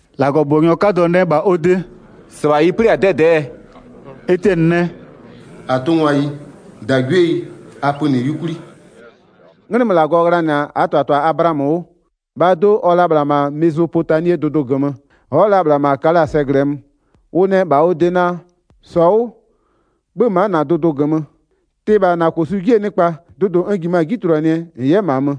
1-Lagɔbʋbɔnyɔ 'kadɔ nɛ -bha ɔ de: “-Sɩbha ɩ 'plɩ-a 'dɛdɛ'ɛɛ?” Etiɛnɩ nɛ: “-Atʋngwayi, -dagwieyi, a pönɩ 'yukwli. 'Nglɩmö -Lagɔ ghlanɩ-a -aa -tɩbhatɩbha Ablaamö 'wʋ, -bhaa do'o ɔ-ɔ la -bhla -ma Mezopotamie dʋdʋ -gömö, ɔ'ɔ la -bhla -ma Kalaa sɛ -glɩɛ mö. Ʋ nɛ -bha ɔ de naa: 3-Sɔ 'wʋ, 'bhö-ö ma'a -na dʋdʋ -gömö, tɩ -bha -na -kosu 'jie nɩkpa, dʋdʋ n -jimö-a 'ji tuluanɩɛ -n 'yɛ -ma mö.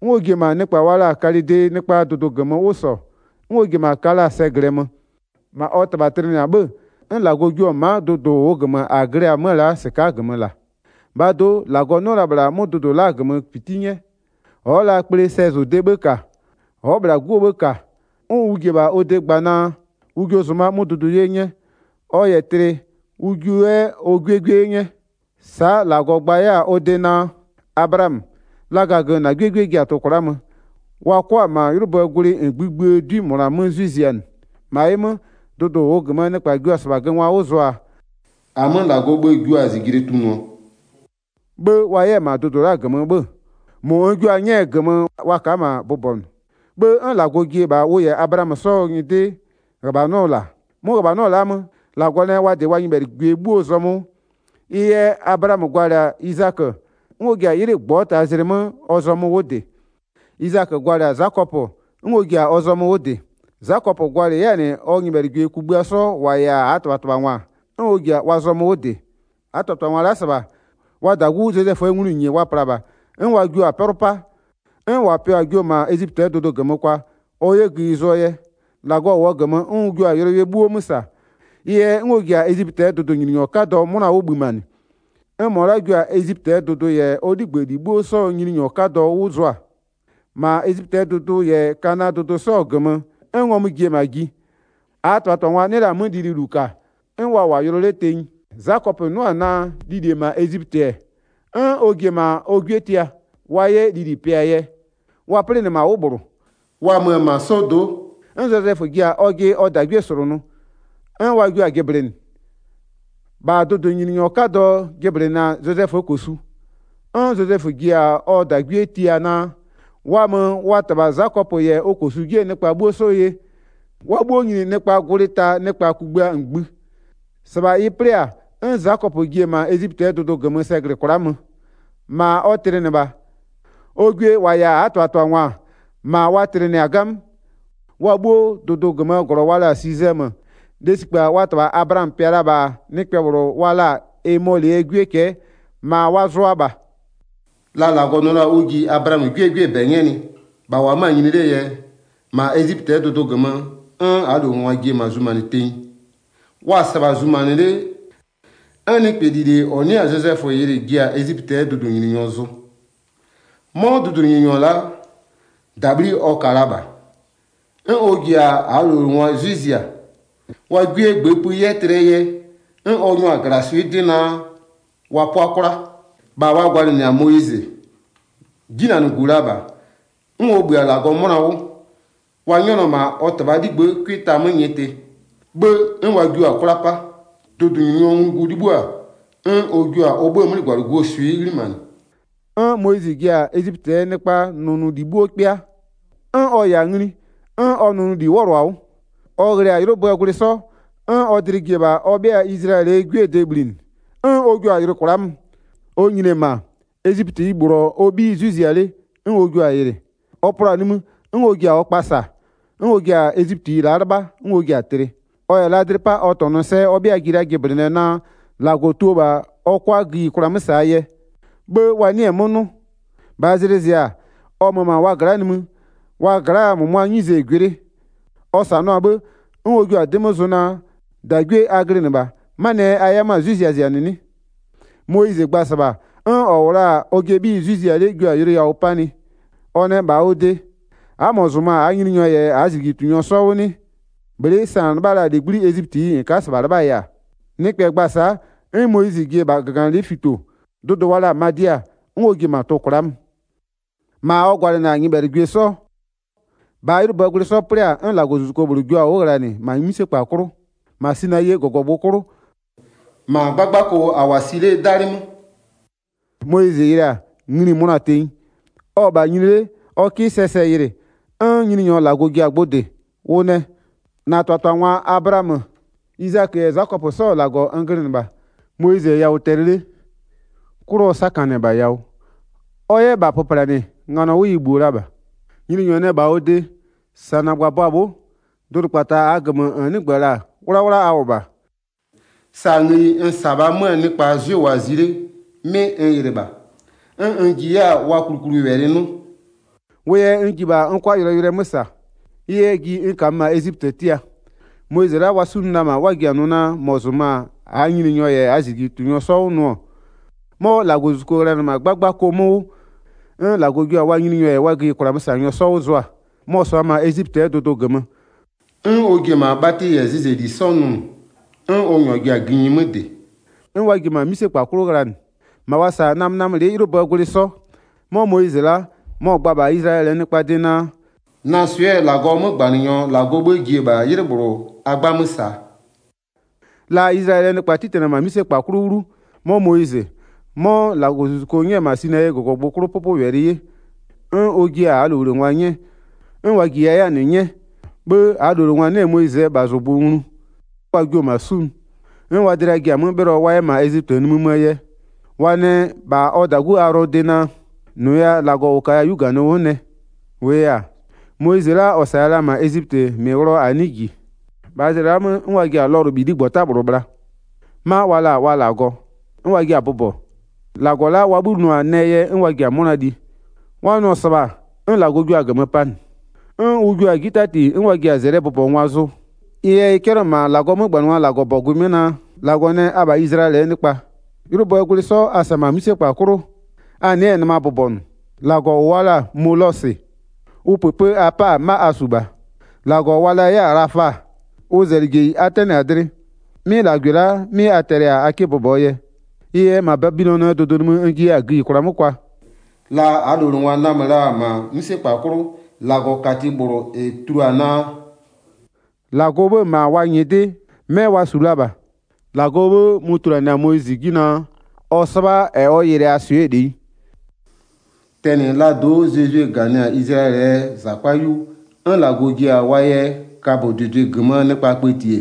'N ɔ ji-e -ma nɩkpa wa la-a Kalɩdee nɩkpaa dʋdʋ -gömö 'wʋ -sɔ, 'n ɔ ji-e -ma Kalaa sɛ -glɩɛ mö. -Ma ɔ -tɩbha tlɩnɩ-a 'bhë, 'n -Lagɔ jio-o ma'a dʋdʋ -ʋʋ -gömö a glɩ-ɛ 'mö-ö la'a -sɩka'a -la. 5-Bhaa do'o, -Lagɔ 'nɩɔ-ɔ la -bhla 'mʋ dʋdʋ la'aa -gömö -piti 'nyɛ, ɔ'ɔ la kplee sɛzʋdee 'bhë -ka. Ɔ'ɔ -bhla 'guo 'bhë -ka 'n ʋ ji-e -bha ɔ de gba naa, ʋ jio zʋma 'mʋ dʋdʋ 'ye 'nyɛ, ɔ -yɛ tlɩ ʋ jiʋ 'yɛ ɔ 'gwiee 'gwie 'ye 'nyɛ. Sa'a -Lagɔ gba 'yɛ-a ɔ de naa: Ablaamö, laga -gömö -na 'gwiee 'gwie ji-a tʋ-ʋ kwla'a möö, wa 'kʋa göngwa 'wʋ zʋa, wa 'kʋa -ma 'ylʋböö gwlɩ -ngbï -ngbïë 'dwi -mʋna 'mö 'zwɩ zianɩ. 7-Ma ɩ 'mö, dʋdʋ -ʋʋ -gömöö nɩkpa jua-a -sɩbha göngwa 'wʋ zʋaa, -amö -Lagɔɔ 'bhë jua-a -zijle tunʋɔ. 'Bhë wa 'yɛ-a -ma dʋdʋ la'a -gömö 'bhö-ö, -mʋ n jua-a 'nyɛɛ -gömö wa ka'a -ma bʋbɔnʋ. 'Bhë 'n -Lagɔ ji-e -bha ʋ -yɛ Ablaamö 'sɔɔ nyɩdɩ -ghöbhanɔ -la. 'Mʋ -ghöbhanɔ la'aa 'mö, -Lagɔ nɛ wa -dɩ wa nyɩbhɛlɩgwie 'bhuoo zɔmö 'wʋ. Ɩ yɛ Ablaamö gwalɩ-a Izakö 'n ɔ ji-a 'ylɩ -ngbɔta zlɩ 'mö ɔ zɔmö 'wʋ -dɩ. Izakö gwalɩ-a Zakɔpö 'n ɔ ji-a ɔ zɔmö 'wʋ -dɩ. Zakɔpö gwalɩ 'yɛ-a -nɩ ɔ nyɩbhɛlɩgwie kugbïa sɔ -wa -yɛ-a -aa -tɩbhatɩbhangwa, 'n ɔ ji-a wa zɔmö 'wʋ -dɩ. 9-Aa -tɩbhatɩbhangwa la'a -sɩbha, wa -dagu Zozɛföö nglʋnyinye wa pla -bha, 'n wa jio-a 'pɛlʋ 'pa. 'N -wa pɩɔ-a jio-o -ma Ezipötɩɛ dʋdʋ -gömö kwa, ɔ 'yɛ gïyi zʋɔ yɛ. 10-Lagɔ -wʋɔ -gömö 'n ʋ jio-a yʋlɔyʋlʋɛ 'bhuo 'mö -sa, 'n ʋ jio-a gbɩjinɔ 'nyɛ, ɩ yɛ 'n ɔ ji-a Ezipötɩɛ dʋdʋnyininyɔ 'kadɔ 'mʋna 'wʋ bhïmanɩ, 'n -mɔ la'a jio-a Ezipötɩɛ dʋdʋ -yɛ ɔ 'ligbëli 'bhuo 'sɔɔ nyininyɔ 'kadɔ 'wʋ zʋa. 11-Ma Ezipötɩɛ dʋdʋ -yɛ Kanaa dʋdʋ 'sɔɔ -gömö 'n ngɔmʋ ji-e -ma ji. -Aa -tɩbhatɩbhangwa 'nɩ la-a 'mö lili -ka, 'n wa -wʋ-a yʋlɔ 'le tenyi. Zakɔpö 'nʋ-ɔ naa lili-e -ma Ezipötɩ-ɛ, 'n ɔ ji-e -ma ɔ 'gwie tia, wa 'yɛ lili pɩa-a yɛ. Wa 'plɩnɩ -ma 'wʋ -bhlʋ. Wa mö-ö -ma 'sɔdo'o, 'n Zozɛfö ji-a ɔjɩ ɔ -dagwie -slʋnʋ 'n wa jio-a jɩblɩnɩ. -Bha dʋdʋnyininyɔ 'kadɔ jɩblɩnɩ-a Zozɛföö -kosu. 'N Zozɛfö ji-a ɔ -dagwie tia naa, wa mö ɔ -tɩbha Zakɔpö -yɛ ɔ -kosu 'jie nɩkpa 'bhuo 'sɔ ye, wa 'bhuo nyini nɩkpaa gwlɩ ta nɩkpa kugbïa -ngbï. 15-Sɩbha ɩ 'plɩ-a, 'n Zakɔpö ji-e -ma Ezipötɩɛ dʋdʋ -gömö sɛ -glɩ kwla'a mö, -ma ɔ tlɩnɩ -bha. Ɔ gwie -wa -yɛ-a -aa -tɩbhatɩbhangwa, -ma wa tlɩnɩ-a 'gamö. Wa 'bhuoo dʋdʋ -gömöö -glɔ wa la-a Sisɛmö, lesikpa wa -tɩbha Ablaamö pɩa la-a -bha nɩkpɛ -bhlʋ wa la-a Emɔlɩɛ 'gwie cɛ'ɛ, -ma wa zʋʋa -bha. La -Lagɔ nʋ la-a ʋ ji Ablaamö 'gwiee 'gwiee -bɛ 'nyɛnɩ -bha -wʋ-ɔ 'mö-a nyini 'lee yɛ, -ma Ezipötɩɛ dʋdʋ -gömö 'n -aa -lowlengwa ji-e -ma zumanɩ tenyi. Wa-a -sɩbha zumanɩ 'le, 'n nɩkpɛ -lile -ɔ 'nɩ-a Zozɛfö yɩlɩ ji-a Ezipötɩɛ dʋdʋnyininyɔ zʋ. 'Mɔ dʋdʋnyininyɔ la'a, -dabhli ɔ ka la -bha. 'N ɔ ji-a -aa -lowlengwa 'zwɩ zia. Wa 'gwiegbëëpï 'yɛ tlɩɛ yɛ, 'n ɔ nyʋa-a -glaswɩ'ɩ 'dɩ naa wa 'pʋa 'kwla. 20-Bha wa gwalɩnɩ-a Moyizɩ. 'Jinanɩgu la -bha, 'n ɔ -bhï-a -Lagɔ 'mʋna 'wʋ. Wa 'nyɛnɩɔ -ma ɔ -tɩbhaa 'ligbë'ë 'cʋɩ ta 'mö nyɩtɩ, 'bhë 'n wa jio-a 'kwla 'pa. Dʋdʋnyininyɔɔ nglugu 'libhïo-a, 'n ɔ jio-a ɔ 'bhëë 'mlɩgwalɩguo swɩ'ɩ 'ghlimanɩ. 'N Moyizɩ ji-a Ezipötɩɛ nɩkpaa nɔnʋli 'bhuo 'kpɩa, 'n ɔ -yɛ-a ngli, 'n ɔ nʋnʋli 'wɔlʋ-a 'wʋ. Ɔ ghlɩ-a 'ylʋböö gwlɩ 'sɔ, 'n ɔ dlɩ ji-e -bha ɔ 'bhɩa Izlayɛlɩɛ 'gwiee de bhlinɩ, 'n ɔ jua-a yɩlɩ kwla'a mö. Ɔ nyini-e -ma, Ezipötiyi -bhlʋ-ɔ ɔ 'bhiyi 'zwɩ zia 'le 'n ɔ jio-a yɩlɩ, ɔ plɔ-a nimï 'n ɔ ji-a ɔ kpa -sa, 'n ɔ ji-a Ezipötiyi la'a 'lɩbha 'n ɔ ji-a tlɩ. Ɔ -yɛ la dlɩ 'pa ɔ -tɔnʋ sɛ ɔ 'bhɩa ji la jɩblɩnɩɛ naa, -Lagɔ tio -bha ɔ 'kʋa gïyikwla 'mö -saa yɛ. 'Bhë wa 'nɩɩ-ɩ 'mö 'nʋ. 26-Bhaa zlɩ zɩ-a, ɔ mö-ö -ma wa gla'a nimï, wa gla'aa -mʋmʋaa 'nyize-e gwɩ 'le. Ɔ -sanʋa-a 'bhë, 'n ɔ jua-a 'dɩ 'mö zʋ naa: -Dagwie a glɩnɩ -bha, 'manɩɛ yɛ a 'yɛ 'mö-a 'zwɩ ziazianɩ 'nɩ? Moyizɩ gba-a -sɩbha, 'n -ɔ -wʋ la-a ɔjɩɛ 'bhiyi 'zwɩ zia 'le jio-a yʋlʋ yawʋ 'panɩ. Ɔ nɛ -bha ɔ de: A'a -mɔ -zʋmö-a -aa nyininyɔ -yɛ -aa -zijlitunyɔ 'sɔ 'wʋ 'nɩ? Bhlɩ'ɩ sa -n 'lɩbha la-a -legbli'i Ezipötiyi -n ka'a -sɩbha 'lɩbhaa yɛ-a? Nɩkpɛ gba-a sa'a, 'n Moyizɩ ji-e -bha -gaganɩlɩ'ɩ fito, dʋdʋ wa la-a Madia 'n ɔ ji-e -ma tʋ-ʋ kwla'a mö. -Ma ɔ gwalɩnɩ-a nyɩbhɛlɩgwie 'sɔ. 30-Bhaa 'ylʋböö gwlɩ 'sɔ 'plɩ-a, 'n -Lagɔzuzuko -bhlʋ jio-a 'wʋ ghlanɩ -ma 'mïsekpa 'klʋ, -ma Sinayie -gɔgɔgbʋ 'klʋ, -ma 'gbagbako -a -wʋ-a si 'lee 'dalɩ 'mö. Moyizɩ yɩlɩɩ-a, ngli-i mönɔ-a tenyi. Ɔ-ɔ -bha nyini 'le ɔ 'kɩ sɛɛ sɛ yɩlɩ, 'n Nyininyɔ -Lagɔ ji-a gbʋ -dɩ. Ʋ nɛ: 32-Na -tɩbhatɩbhangwa Ablaamö, Izakö -yɛ Zakɔpö 'sɔɔ -Lagɔ n glɩnɩ -bha. Moyizɩ-ɛ yawʋ tɛlɩ 'le, 'klʋ ɔ 'sakanɩ-ɛ -bha yawʋ, ɔ 'yɛ -bha pöplanɩ, nganɔ 'wʋ ɩ -bhïo la -bha. Nyininyɔ nɛ -bha ɔ de: -Sa -na -gbabʋa bhʋ'ʋ, dʋdʋkpata -aa -gömö -n 'nɩgbö-ö -la 'wlawla a -wʋ -bha. Sa ngëyi n -sa-a -bhaa 'möö nɩkpa 'zwɩ -wʋʋa-a zi 'le, 'mɩ n yɩlɩ -bha, 'n n ji 'yɛ-a wa klukluwɛlɩ 'nʋ, wʋ yɛ n ji -bha n 'kʋa yʋlɔyʋlʋɛ 'mö -sa. Ɩ yɛ, ji n -kamö -ma Ezipötɩ tia. Moyizɩ la'a -ɔ wa 'sunʋ la-a -ma, 'n wa ji-a nʋ naa: -Mɔ -zʋmö-a -aa nyininyɔ -yɛ -aa -zijlitunyɔ 'sɔ 'wʋ nʋ-ɔ, 'mɔ -Lagɔzuzuko ghlanɩ-ɛ -ma 'gbagbako 'mö 'wʋ, 'n -Lagɔ jio-a wa nyininyɔ -yɛ wa gïyikwlaa 'mösanyɔ 'sɔ 'wʋ zʋa. Mɔ-ɔ -sʋa-a -ma Ezipötɩɛ dʋdʋ -gömö, 'n ɔ ji-e -ma bhatɩ -yɛ zɩzɛli 'sɔ nʋnʋ, 'n ɔ -nyʋa ji-a gïnyi 'mö -dɩ, 'n wa ji-e -ma 'mïsekpa 'klʋ ghlanɩ, -ma wa -sa-a namönamölɩ'ɩ 'ylʋböö gwlɩ 'sɔ. 'Mɔ Moyizɩ la'a, mɔ-ɔ gba-a -bha Izlayɛlɩɛ nɩkpaa de naa: Na swɩ'ɩɛ -Lagɔɔ 'mögbanɩnyɔ -Lagɔɔ 'bhë ji-e -bha 'ylɩ -bhlʋ a 'gbamö -saa. La Izlayɛlɩɛ nɩkpa 'titanɩ-ɛ -ma 'mïsekpa 'klʋ 'wlu, 'mɔ Moyizɩ, 'mɔ -Lagɔzuzuko 'nyɛ-ɛ -ma Sinayie -gɔgɔgbʋ 'klʋ 'pʋpʋwɛlɩ 'ye, 'n ɔ jiɩ-a -aa -lowlengwa 'nyɛ, 'n wa -jiya 'yɛ-a -nɩ 'nyɛ. 'Bhë -aa -lowlengwa 'nɩ-ɛ Moyizɩɛ -bhazʋgbʋ nglu, 'n wa jio-o -ma 'sunʋ, 'n wa dlɩa ji-a 'mö 'bhɩlɔ wa 'yɛ -ma Ezipötɩ nimï möö yɛ. Wa nɛ -bha ɔ -dagu Aghlɔɔ de naa: -Nʋya -lagɔ -ʋ -kaya-a 'yu -ganɩ 'wʋ nɛ. -Wʋʋ yɛ-a, Moyizɩ la'a -ɔ -saya la-a -ma Ezipötɩ, -mɩ ghlɩɔ -a 'nɩɩ -ji. 41-Bhaa zlɩa la'a 'mö, 'n wa ji-a lɔlʋbhiligbɔta bhla, 'ma wa la-a wa -lagɔ, 'n wa jia-a bʋbɔ, -lagɔ la'a wa 'bhï nʋ-a nɛɛ yɛ 'n wa ji-a 'mʋna li. Wa nʋ-ɔ -sɩbha 'n -Lagɔ jua-a -gömö panɩ, 'n ʋ jua-a 'ji 'tati 'n wa ji-a -zɛlɩɛ bʋbɔngwa zʋ. Ɩ yɛ ɩ 'cɛlɩɔ-ɔ -ma -Lagɔɔ 'mögbanɩngwaa -Lagɔbɔgʋɩ 'mö naa: -Lagɔ nɛ: Abha Izlayɛlɩɛ nɩkpa, 'ylʋböö gwlɩ 'sɔ a -sa-a -ma 'mïsekpa 'klʋ, a nɩ'ɩ-ɛ nɩma bʋbɔnʋ, 43-lagɔ -ʋ wa la-a Molosɩ, ʋ -pëpë a 'pa-a 'ma a -su -bha, -lagɔ wa la 'yɛ-a Ghlafa ʋ -zɛlɩjeyi a 'tɛnɩ-a dlɩ. 'Mɩ -lagwɩ la'a, 'mɩ a tɛlɩ-a a 'kɩ bʋbɔɔ yɛ. Ɩ yɛ -ma Babilɔnɩɛ dʋdʋ nimï n jiya-a gïyikwla 'mö kwaa. La -aa -lowlengwa namö la-a -ma 'mïsekpa 'klʋ -Lagɔkati -bhlʋ -ɛ tulua-a naa, -Lagɔɔ 'bhë-ë -ma wa nyɩdɩ 'mɛ wa -su la -bha, -Lagɔɔ 'bhë mʋ-ʋ tuluanɩɛ-a Moyizɩ 'ji naa: Ɔ 'sɩbha -ɛ ɔ yɩlɩ-aa swɩ'ɩɛ -leyi. Tɛnɩ laa do'o Zozwie -ganɩ-a Izlayɛlɩɛ -zakpa 'yu 'n -Lagɔ ji-a wa yɛ kabödʋdʋɩ -gömöö nɩkpa kpëti-e,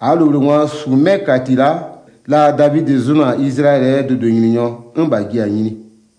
-aa -lowlengwa -su 'mɛ -kati la'a, la Davidɩ zʋnʋ-a Izlayɛlɩɛ dʋdʋnyininyɔ 'n -bha ji-a nyini.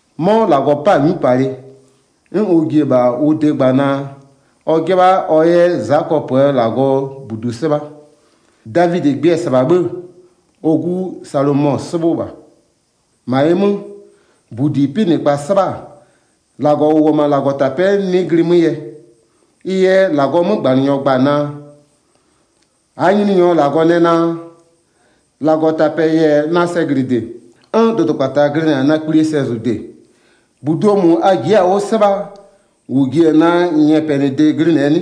'Mɔ -Lagɔ 'pa-a 'nyupalɩ, 'n ɔ ji-e -bha ʋ de gba naa, ɔ 'jɩbha ɔ 'yɛ Zakɔpöö -Lagɔɔ -budu 'sɩbha. Davidɩ gbɩ-ɛ 'sɩbha 'bhë, ɔ 'gu Salomɔ-ɔ 'sɩbhʋ -bha. 48-Ma ɩ 'mö, -budi 'pɩnɩkpa 'sɩbha-a, -Lagɔ -ʋ -wʋ-ɔ -ma -Lagɔtapɛ'ɛ 'nɩ glɩɩ 'mö yɛ, ɩ yɛ -Lagɔɔ 'mögbanɩnyɔ gba-a naa: 49-Aa Nyininyɔ -Lagɔ nɛ naa: -Lagɔtapɛ'ɛ-ɛ -yɛ-a na sɛglɩde, 'n dʋdʋkpata glɩnɩ-a na kplie sɛzʋde. -Buduo -mʋ a ji'i-a 'wʋ 'sɩbhaa -ʋ ji-e na nyɛpɛnɩde glɩnɩɛ 'nɩ?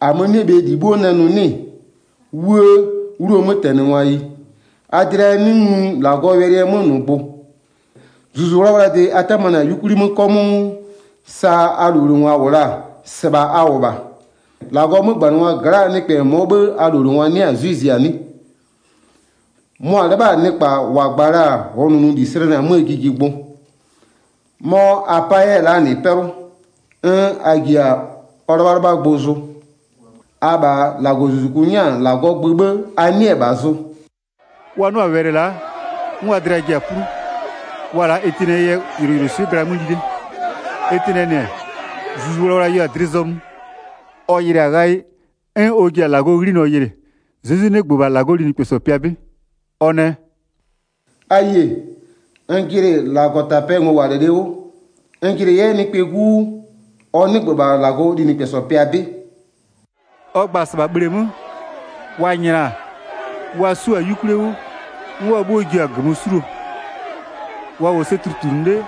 50-Amö-ö 'nɩ-ɛ bhe -li 'bhuo nɛ nʋ 'nɩ-ɩ? 'Wuë! 'Wluo mötɛnɩngwayi, a dlɩa 'nɩ nglu -Lagɔɔ wɛlɩɛ 'mönʋgbʋ. Zuzu 'Wlawlaa de a 'tamanɩ-a 'yukwli 'mö 'kɔmʋʋ, sa a -lowlengwa -wʋ la-a, -sɩbha a -wʋ -bha. 52-Lagɔɔ 'mögbanɩngwa gla'aa nɩkpɛ -mɔɔ 'bhë a -lowlengwa 'nɩ-a 'zwɩ zia 'nɩ? Mʋa-a 'lɩbha-a nɩkpa -wa gba la-a -ɔɔ nʋnʋli slɛnɩ-a 'möö jijigbʋ, 'mɔ a 'pa 'yɛ-a la'a -nɩ 'pɛlʋ, 'n a ji-a ɔ 'lɩbhalɩbhangwa zʋ. Abha -Lagɔzuzuku 'nyɛ-a -Lagɔɔ gbö 'bhë a 'nɩɩ-ɛ -bha zʋ.” Wa 'nʋ-a wɛlɩ la'a, 'n wa dlɩa ji-a 'plu. Wa-a la'a Etiɛnɩɛ yɛ yʋlʋswɩ'ɩ gla 'mö li 'le. Etiɛnɩɛ -nɩ-ɛ, Zuzu 'Wlawla yeo-a dlɩ zɔmö, ɔ yɩlɩ-a ghayɩ, 'n ɔ ji-a -Lagɔɔ 'ghlinɔ yɩlɩ, Zezwi 'nɩgbö -bha -Lagɔɔ linɩkpɛsɔ pɩa 'bɩ. Ɔ nɛ: “A yie, n jɩnɩ -Lagɔtapɛɛ ngowalɩlɩ 'wʋ, n jɩnɩ 'yɛ Nɩkpɛɛ 'Gu 'wʋ, ɔ 'nɩgbö -bha -Lagɔɔ linɩkpɛsɔ pɩa 'bɩ.” Ɔ gba-a -sɩbha bhleemö, wa nyla-a, wa 'su-a 'yukwlie 'wʋ, 'n wa 'bhuo jio-a -gömö 'suluo. Wa -wʋɔ sɛ tutlunʋ 'le, 'n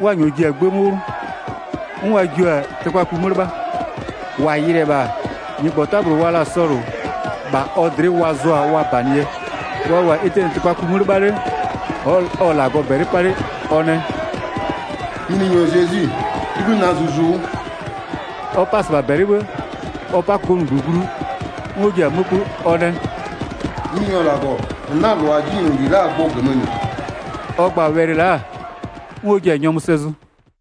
wa -nyɔɔ ji-a 'gbë 'mö 'wlʋ, 'n wa jio-a tɩkpaku 'mö 'lɩbha. -Wa yɩlɩ-ɛ -bha, nyɩgbɔta -bhlʋ wa la-a Sɔlʋ, -bha ɔ dlɩ'ɩ wa zʋ-a wa -banɩ yɛ. Wa -wʋ-a Etiɛnɩ tɩkpaku 'mö 'lɩbha 'le, ɔ-ɔ -Lagɔ -bɛlɩ 'pa 'le, ɔ nɛ: “Nyininyɔ Zezwi, 'libhï na zuzu 'wʋ.” Ɔ 'pa-a -sɩbha -bɛlɩ 'bhë, ɔ 'pa-a -kokomunigbö glu, 'n ɔ ji-a 'mö 'kpö, ɔ nɛ: “Nyininyɔ -Lagɔ, -n 'na-a -lʋa 'jinyloli la'aa gbʋ -gömö -nɩ.” Ɔ gba-a wɛlɩ la'a, 'n ɔ ji-a nyɔmʋ sɛ zʋ.